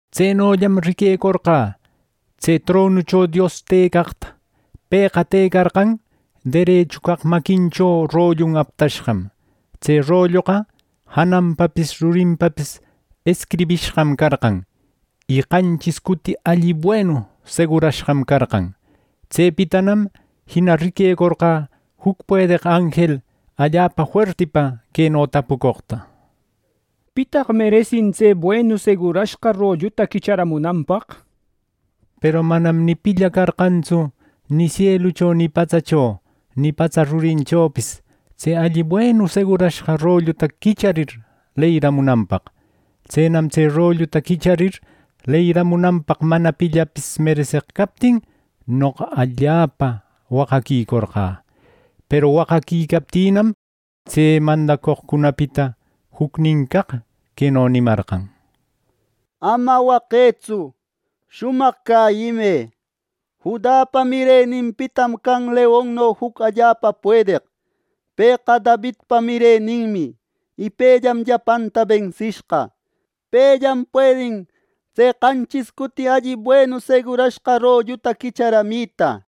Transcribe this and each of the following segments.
Tsenollam riquecorqä tse tronucho Dios tëcaqta. Pëqa tëcarqan derechu caq maquincho rollun aptashqam. Tse rolloqa jananpapis rurinpapis escribishqam carqan, y qanchis cuti alli buenu segurashqam carqan. Tsepitanam jina riquecorqä juc puedeq anjel allapa fuertipa queno tapucoqta: “¿Pitaq meresin tse buenu segurashqa rolluta quicharamunanpaq?” nir. Peru manam ni pilla carqantsu, ni sielucho, ni patsacho, ni patsa rurinchopis tse alli buenu segurashqa rolluta quicharir leyiramunanpaq. Tsenam tse rolluta quicharir leyiramunanpaq mana pillapis mereseq captin, noqa allapa waqaquicorqä. Peru waqaquicaptïnam, tse mandacoqcunapita jucnin caq queno nimarqan: “Ama waqëtsu; shumaq cäyimë. Judapa mireninpitam can leonno juc allapa puedeq. Pëqa Davidpa mireninmi, y pellam llapanta bensishqa. Pellam puedin tse qanchis cuti alli buenu segurashqa rolluta quicharamita.”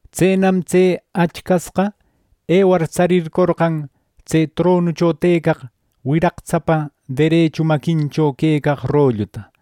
Tsenam tse Achcasqa ewar, tsarircorqan tse tronucho tëcaq wiraqtsapa derechu maquincho quecaq rolluta.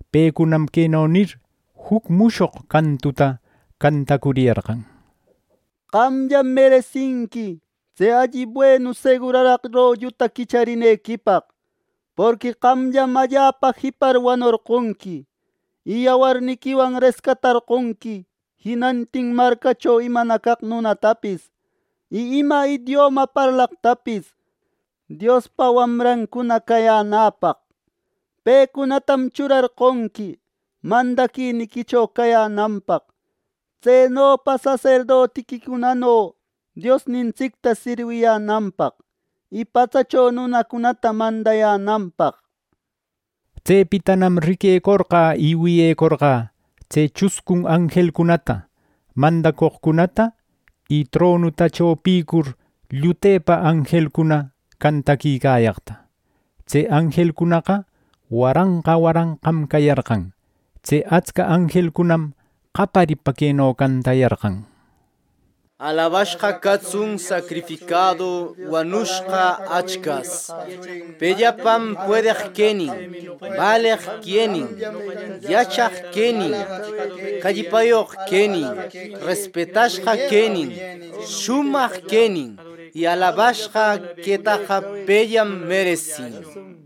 Pecunam queno nir juc mushoq cantuta cantacuriyarqan: “Qamllam meresinqui tse alli buenu seguraraq rolluta quicharinequipaq. Porqui qamllam allapa jipar wanorqonqui, y yawarniquiwan rescatarqonqui jinantin marcacho imana caq nunatapis, y ima idioma parlaqtapis Diospa wamrancuna cayänäpaq. Pecunatam churarqonqui mandaquiniquicho cayänanpaq, tsenopa saserdoticunano Diosnintsicta sirwiyänanpaq y patsacho nunacunata mandayänanpaq” nir. Tsepitanam riquecorqä y wiyecorqä tse chuscun anjelcunata, mandacoqcunata y tronuta chopïcur llutepa anjelcuna cantaquicayaqta. Tse anjelcunaqa waranqa waranqam cayarqan. Tse atsca anjelcunam qaparipa queno cantayarqan: “¡Alabashqa catsun sacrificadu wanushqa Achcas. Pellapam puedeq quenin, baleq quenin, yachaq quenin, callpayoq quenin, respetashqa quenin, shumaq quenin; y alabashqa quetaqa pellam meresin!” nir.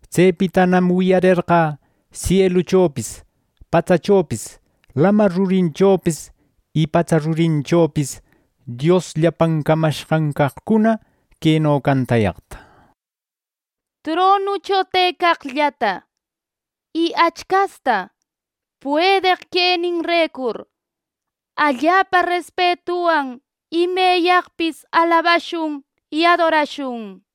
Tsepitanam wiyarerqä sieluchopis, patsachopis, lamar rurinchopis y patsa rurinchopis Dios llapan camashqan caqcuna queno cantayaqta: “¡Tronucho tëcaqllata y Achcasta, puedeq queninrecur allapa respetuwan imeyaqpis alabashun y adorashun!” nir.